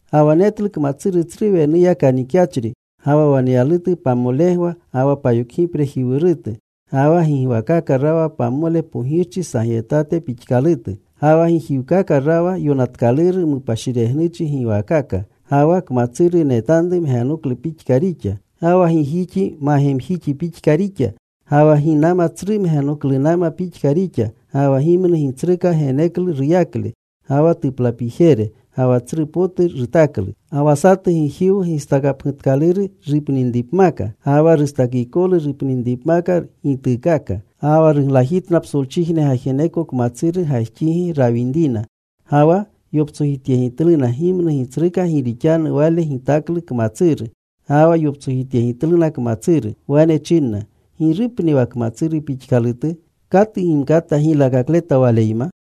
Ga wa netlu kmatsuru tsru wenuya kanikyachri. Ga wa waneyalutu pamolegwa ga wa payokgiprejiwuruta. Ga wa gigwakaka rawa pamole pogirchi sagyetate pixkalutu. Ga wa gijiwkaka rawa yonatkaluru mupashiregnuchi giwaakaka. Ga wa kmatsuru netanru mgenoklu pixka rixa. Ga wa gijixi magemjixi pixka rixa. Ga wa ginama tsru mgenoklunama pixka rixa. Ga wa gimnu gitsruka geneklu ruyakle ga wa tuplapijere. Ga wa tsru potu rutaklu. Ga wa satu gijiwu gistakapgutatkaluru rupninripmaka. Ga wa rustakikolu rupninripmaka gituukaaka. Ga wa ruglajitna psolchijne gajeneko kmatsuru gajxigi rawinrina. Ga wa yoptsojityegitluna gimnu gitsruka gi rixanu wale gitaklu kmatsuru. Ga wa yoptsojityegitluna kmatsuru. Wane chinna, “¿Girupni wa kmatsuru pixkalutu? ¿Katu gimkata giylakakleta waleyma?”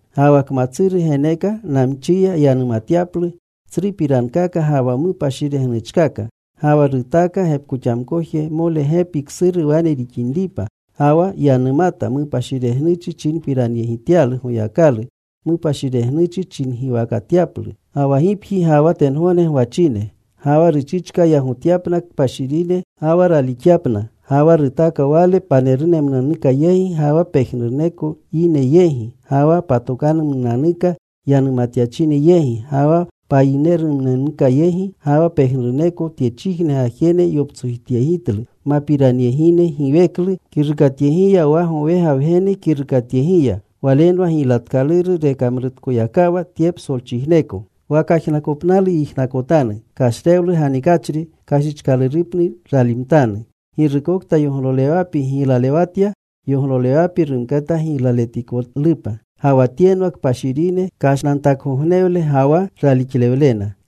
Ga wa kmatsuru geneeka namchiya yanumatyaplu tsrupirankaka ga wa mupashiregnuchkaka. Ga wa rutaaka gepkoxamkojmole gepi ksuru wane rixinripa. Ga wa yanumata mupashiregnuchi chinpiranyegityaplu Goyakalu. Mupashiregnuchi chingiwakatyaplu ga wa gipji, ga wa tengogne gwachine. Ga wa ruchichka yagotyapna kpashirine, ga wa raalixyapna. Ga wa rutaaka wale panerumnunanuka yegi, ga wa pejnuruneko yine yegi, ga wa patokanumnunanuka yanumatyachine yegi, ga wa payinemnunanuka yegi. Ga wa pejnuruneko tyechijne gwachine yoptsojityegitlu mapiranyegine giweklu kirukatyegiya wa gowega Wgene kirukatyegiya. Walenwa gilyatkaluru rekamrutkoyakawa tye psolchijneko. Wa kajnakopnalu yijnakotanu: Kashrewlu ganikachri, kashichkalurupni ralimtanu. Girukokta yoglolewapi giylalewatya, yoglolewapi rumkata giylaletikolupa. Ga wa tyenwa kpashirine kashnantakgognewle ga wa ralixlewlena.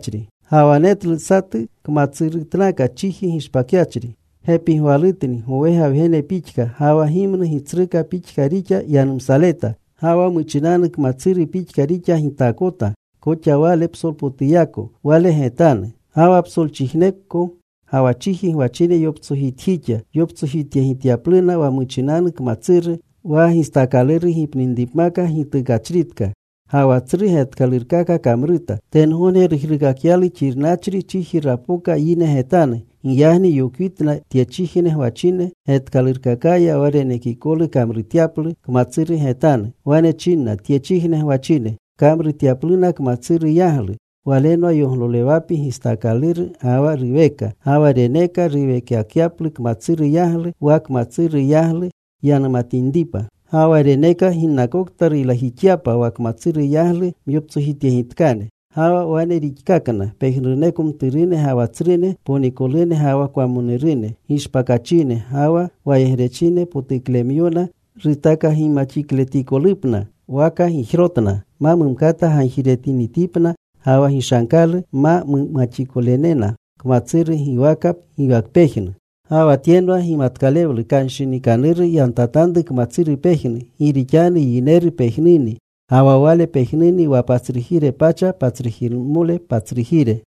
Ga wa netlu satu kmatsurutnaka chiji gishpakyachri. Gepigwalutni gowega Wgene pixka. Ga wa gimnu gitsruka pixka rixa yanumsaleta. Ga wa muchinanu kmatsuru pixka rixa gitaakotu koxa wale psolpotuyako, wale getanu. Ga wa psolchijneko ga wa chiji gwachine yoptsojitjixa, yoptsojityegityapluna wa muchinanu kmatsuru, wa gistaakaluru gipninripmaka gitukachritka. Ga wa tsru getkalurkaka kamruta. Tengogne rujruukakyalu xirnachri. Chiji rapoka yine getanu. Giyagni yokwitna tyechijne gwachine getkalurkakaya wa renekikolu kamrutyaplu kmatsuru getanu. Wane chinna tyechijne gwachine kamrutyapluna kmatsuru yaglu. Walenwa yoglolewapi gitsakikaluru ga wa ruweka. Ga wa reneeka ruweekakyaplu kmatsuru yaglu, wa kmatsuru yaglu yanumatinripa. Ga wa reneeka ginnakokta ruylajixyapa wa kmatsuru yaglu myoptsojityegitkane. Ga wa wane rixkakna pejnuruneko mturune ga wa tsrune, ponikolune ga wa kwamonurune, gishpakachine ga wa wayegrechine, potuklemyona rutakagimaxikletikolupna waka gijrotna. Ma mumkata gagjiretinitipna ga wa gishankalu mumaxikolenena kmatsuru giwaka waka giwakpejnu. Ga wa tyenwa gimatkalewlu. Kanshinikanuru yantatanru kmatsuru pejnu. Gi rixanu yineru pejnuni. Ga wa wale pejnuni wa patsrujire pacha patsrujiremole patsrujire.